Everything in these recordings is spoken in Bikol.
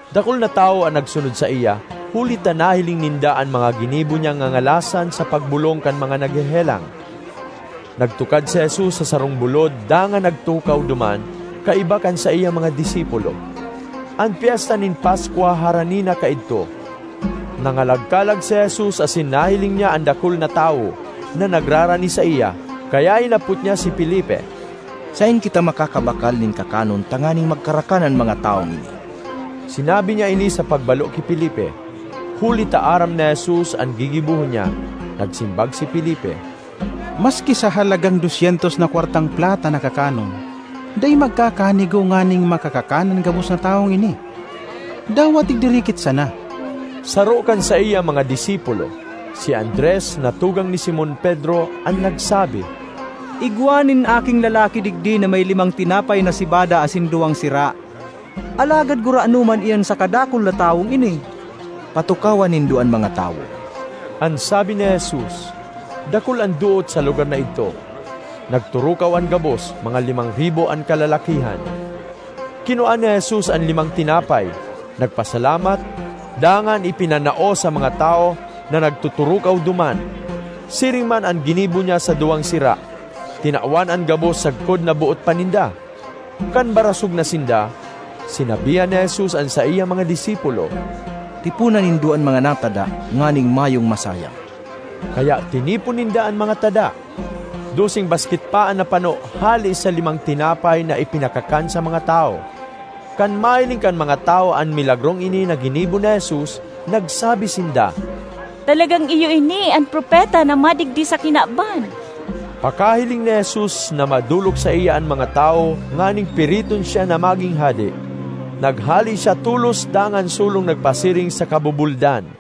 Dakul na tawo an nagsunod saiya, huli ta nahiling ninda an mga ginibo niyang ngangalasan sa pagbolong kan mga naghehelang. Nagtukad si Jesus sa sarong bulod dangan nagtukaw duman kaiba kan saiyang mga disipulo. An Pyesta nin Paskwa harani na kaidto. Nangalagkalag si Jesus asin nahiling niya an dakul na tawo na nagrarani saiya, kaya hinapot niya si Felipe, “Saen kita makakabakal nin kakanon tanganing magkarakan an mga tawong ini?” (Sinabi niya ini sa pagbalo ki Felipe, huli ta aram ni Jesus an gigibohon niya.) Nagsimbag si Felipe, “Maski sa halagang dos syentos na kwartang plata na kakanon, dai magkakanigo nganing makakakan an gabos na tawong ini dawa tigdirikit sana.” Saro kan saiyang mga disipulo, si Andres na tugang ni Simon Pedro, an nagsabi, ”Igwa nin aking lalaki digdi na may limang tinapay na sebada asin duwang sira. Alagad gurano man iyan sa kadakul na tawong ini?” ”Patukawa nindo an mga tawo,” an sabi ni Jesus. (Dakul an doot sa lugar na idto.) Nagturukaw an gabos; mga limang ribo an kalalakihan. Kinua ni Jesus an limang tinapay, nagpasalamat, dangan ipinanao sa mga tawo na nagtuturukaw duman. Siring man an ginibo niya sa duwang sira. Tinawan an gabos sagkod na boot pa ninda. Kan barasog na sinda, sinabihan ni Jesus an saiyang mga disipulo, “Tipona nindo an mga natada nganing mayong masayang.” Kaya tinipon ninda an mga tada; doseng basket pa an napano hale sa limang tinapay na ipinakakan sa mga tawo. Kan mahiling kan mga tawo an milagrong ini na ginibo ni Jesus, nagsabi sinda, “Talagang iyo ini an Propeta na madigdi sa kinaban!” Pakahiling ni Jesus na madolok saiya an mga tawo nganing piriton siya na magin hade, naghale siya tolos dangan solong nagpasiring sa kabubuldan.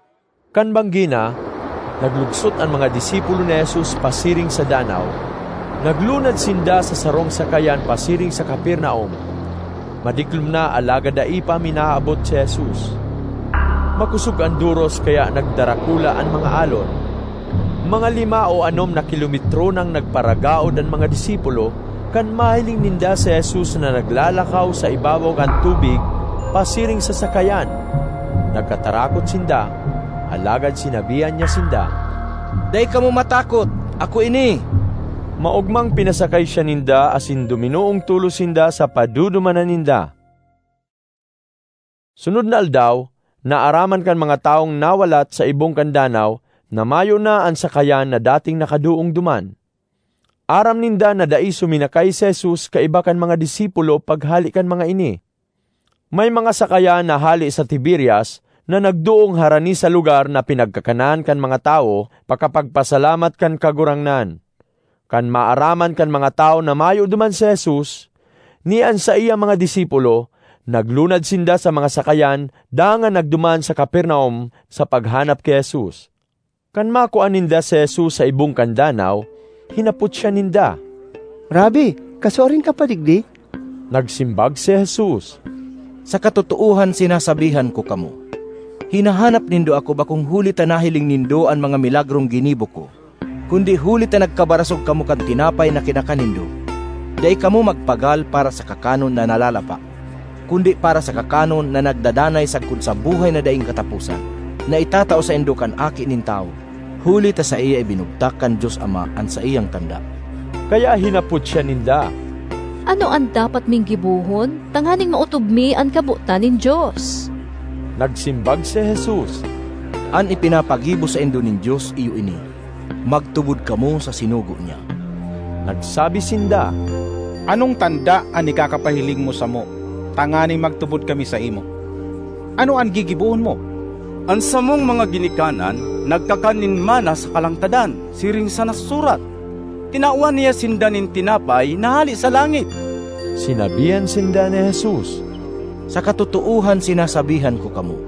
Kan banggi na, naglugsot an mga disipulo ni Jesus pasiring sa danaw. Naglunad sinda sa sarong sakayan pasiring sa Capernaum. Madiklom na alagad dai pa minaabot si Jesus. Makosog an doros kaya nagdarakula an mga alon. Mga lima o anom na kilometro nang nagparagaod an mga disipulo, kan mahiling ninda si Jesus na naglalakaw sa ibabaw kan tubig pasiring sa sakayan. Nagkatarakot sinda, alagad sinabihan niya sinda, “Dai kamo matakot; ako ini!” Maogmang pinasakay siya ninda asin duminoong tolos sinda sa padudumanan ninda. Sunod na aldaw, naaraman kan mga tawong nawalat sa ibong kan danaw na mayo na an sakayan na dating nakadoong duman. Aram ninda na dai suminakay si Jesus kaiba kan mga disipulo paghale kan mga ini. May mga sakayan na hale sa Tiberias na nagdoong harani sa lugar na pinagkakanan kan mga tawo pakapagpasalamat kan Kagurangnan. Kan maaraman kan mga tawo na mayo duman si Jesus, ni an saiyang mga disipulo, naglunad sinda sa mga sakayan dangan nagduman sa Capernaum sa paghanap ki Jesus. Kan makua ninda si Jesus sa ibong kan danaw, hinapot siya ninda, “Rabbi, kasuarin ka pa digdi?” Nagsimbag si Jesus, “Sa katotoohan sinasabihan ko kamo, hinahanap nindo ako bakong huli ta nahiling nindo an mga milagrong ginibo ko, kundi huli ta nagkabarasog kamo kan tinapay na kinakan nindo. Dai kamo magpagal para sa kakanon na nalalapa, kundi para sa kakanon na nagdadanay sagkod sa buhay na daing kataposan, na itatao saindo kan Aki nin Tawo; huli ta sa saiya ibinugtak kan Dios Ama an saiyang tanda.” Kaya hinapot siya ninda, “Ano an dapat ming gibohon tanganing maotob mi an kabotan nin Dios?” Nagsimbag si Jesus, “An ipinapagibo saindo nin Dios iyo ini: magtubod kamo sa sinugo niya.” Nagsabi sinda, “Anong tanda an ikakapahiling mo samo tanganing magtubod kami saimo? Ano an gigibohon mo? An samong mga ginikanan nagkakan nin manna sa kalangtadan siring sa nasusurat, ‘Tinawan niya sinda nin tinapay na hale sa langit!’” Sinabihan sinda ni Jesus, “Sa katotoohan sinasabihan ko kamo,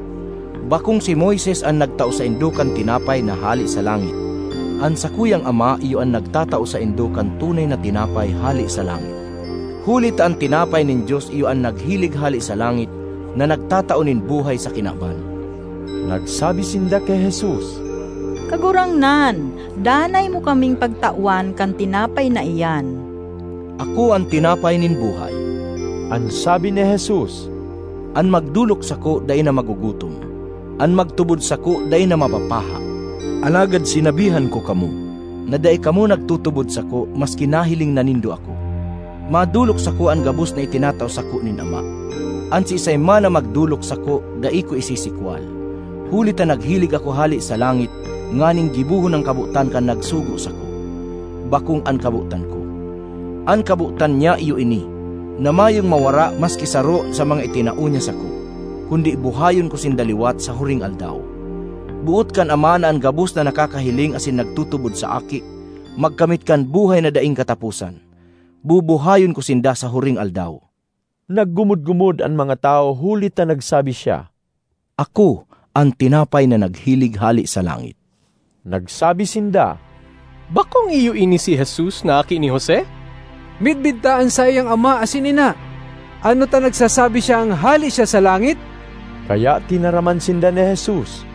bakong si Moises an nagtao saindo kan tinapay na hale sa langit; an sakuyang Ama iyo an nagtatao saindo kan tunay na tinapay hale sa langit. Huli ta an tinapay nin Dios iyo an naghilig hale sa langit na nagtatao nin buhay sa kinaban.” Nagsabi sinda ki Jesus, “Kagurangnan, danay mo kaming pagtawan kan tinapay na iyan.” ”Ako an tinapay nin buhay,” an sabi ni Jesus. “An magdolok sako dai na magugutom; an magtubod sako dai na mapapaha. Alagad sinabihan ko kamo na dai kamo nagtutubod sako maski nahiling na nindo ako. Madolok sako an gabos na itinatao sako nin Ama. An siisay man na magdolok sako dai ko isisikwal, huli ta naghilig ako hale sa langit nganing gibohon an kabotan kan nagsugo sako, bakong an kabotan ko. An kabotan niya iyo ini: na mayong mawara maski saro sa mga itinao niya sako, kundi buhayon ko sinda liwat sa huring aldaw. Boot kan Ama na an gabos na nakakahiling asin nagtutubod sa Aki magkamit kan buhay na daing kataposan; bubuhayon ko sinda sa huring aldaw.” Naggumod-gumod an mga tawo huli ta nagsabi siya, “Ako an tinapay na naghilig hale sa langit.” Nagsabi sinda, “Bakong iyo ini si Jesus na aki ni Jose? Midbid ta an saiyang ama asin ina. Ano ta nagsasabi siyang hale siya sa langit?” Kaya tinaraman sinda ni Jesus,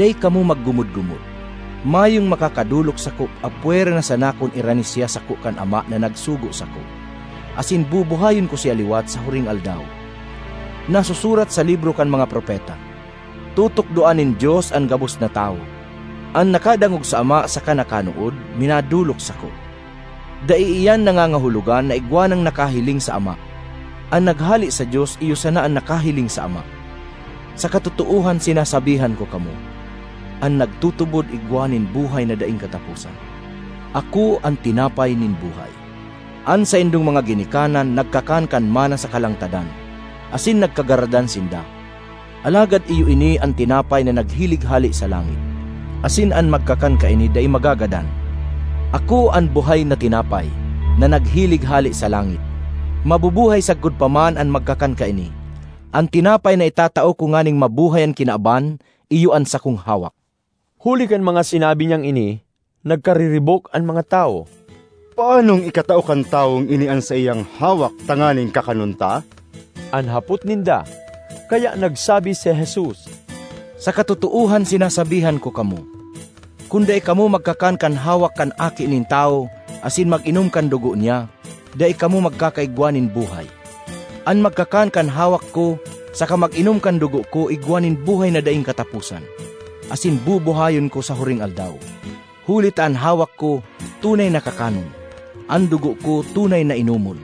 “Dai kamo magumod-gumod. Mayong makakadolok sako apwera na sana kun irani siya sako kan Ama na nagsugo sako; asin bubuhayon ko siya liwat sa huring aldaw. Nasusurat sa libro kan mga propeta, ‘Tutukdoan nin Dios an gabos na tawo.’ An nakadangog sa ama saka nakanood, minadolok sako. Dai iyan nangangahulugan na igwa nang nakahiling sa Ama; an naghale sa Dios iyo sana an nakahiling sa Ama. Sa katotoohan sinasabihan ko kamo, an nagtutubod igwa nin buhay na daing kataposan. Ako an tinapay nin buhay. An saindong mga ginikanan nagkakan kan manna sa kalangtadan, asin nagkagaradan sinda. Alagad iyo ini an tinapay na naghilig hale sa langit, asin an magkakan kaini dai magagadan. Ako an buhay na tinapay na naghilig hale sa langit. Mabubuhay sagkod pa man an magkakan kaini. An tinapay na itatao ko nganing mabuhay an kinaban iyo an sakong hawak.” Huli kan mga sinabi niyang ini, nagkariribok an mga tawo. “Paanong ikatao kan tawong ini an saiyang hawak tanganing kakanon ta?” an hapot ninda. Kaya nagsabi si Jesus, “Sa katotoohan sinasabihan ko kamo, kun dai kamo magkakan kan hawak kan Aki nin Tawo asin mag-inom kan dugo niya, dai kamo magkakaigwa nin buhay. An magkakan kan hawak ko saka mag-inom kan dugo ko igwa nin buhay na daing kataposan, asin bubuhayon ko sa huring aldaw. Huli ta an hawak ko tunay na kakanon; an dugo ko tunay na inomon.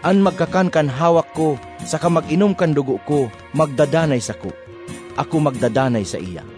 An magkakan kan hawak ko saka mag-inom kan dugo ko magdadanay sako; ako magdadanay saiya.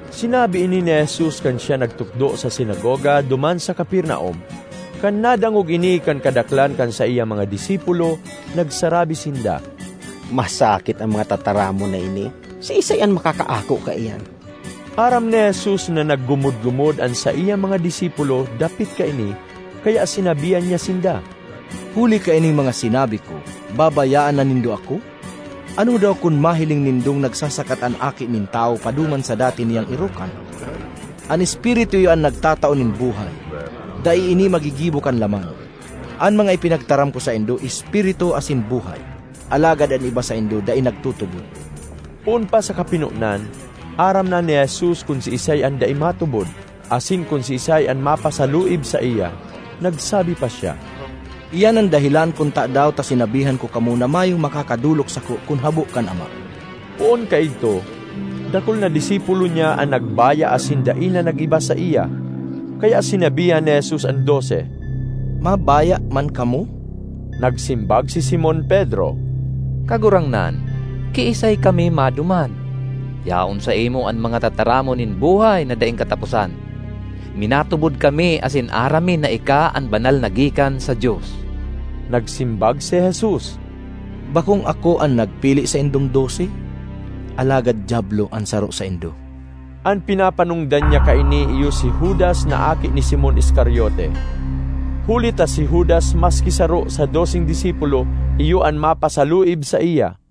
Sinabi ini ni Jesus kan siya nagtukdo sa sinagoga duman sa Capernaum. Kan nadangog ini kan kadaklan kan saiyang mga disipulo, nagsarabi sinda, “Masakit an mga tataramon na ini; siisay an makakaako kaiyan?” Aram ni Jesus na naggumod-gumod an saiyang mga disipulo dapit kaini kaya sinabihan niya sinda, “huli kaining mga sinabi ko, babayaan na nindo ako? Ano daw kun mahiling nindong nagsasakat an Aki nin Tawo paduman sa dati niyang erokan? An Espiritu iyo an nagtatao nin buhay; dai ini magigibo kan laman. An mga ipinagtaram ko saindo, Espiritu asin buhay. Alagad an iba saindo dai nagtutubod.” (Poon pa sa kapinonan, aram na ni Jesus kun siisay an dai matubod, asin kun siisay an mapasaluib saiya.) Nagsabi pa siya, “Iyan an dahelan kun tadaw ta sinabihan ko kamo na mayong makakadolok sako kun habo an Ama.” Poon kaidto, dakul na disipulo niya an nagbaya asin dai na nag-iba saiya. Kaya sinabihan ni Jesus an dose, “Mabaya man kamo?” Nagsimbag si Simon Pedro, “Kagurangnan, kiisay kami maduman? Yaon saimo an mga tataramon nin buhay na daing kataposan. Minatubod kami asin aram mi na ika an Banal na gikan sa Dios.” Nagsimbag si Jesus, “Bakong ako an nagpili saindong dose? Alagad diablo an saro saindo!” An pinapanongdan niya kaini iyo si Judas na aki ni Simon Iscariote. Huli ta si Judas, maski saro sa doseng disipulo, iyo an mapasaluib saiya.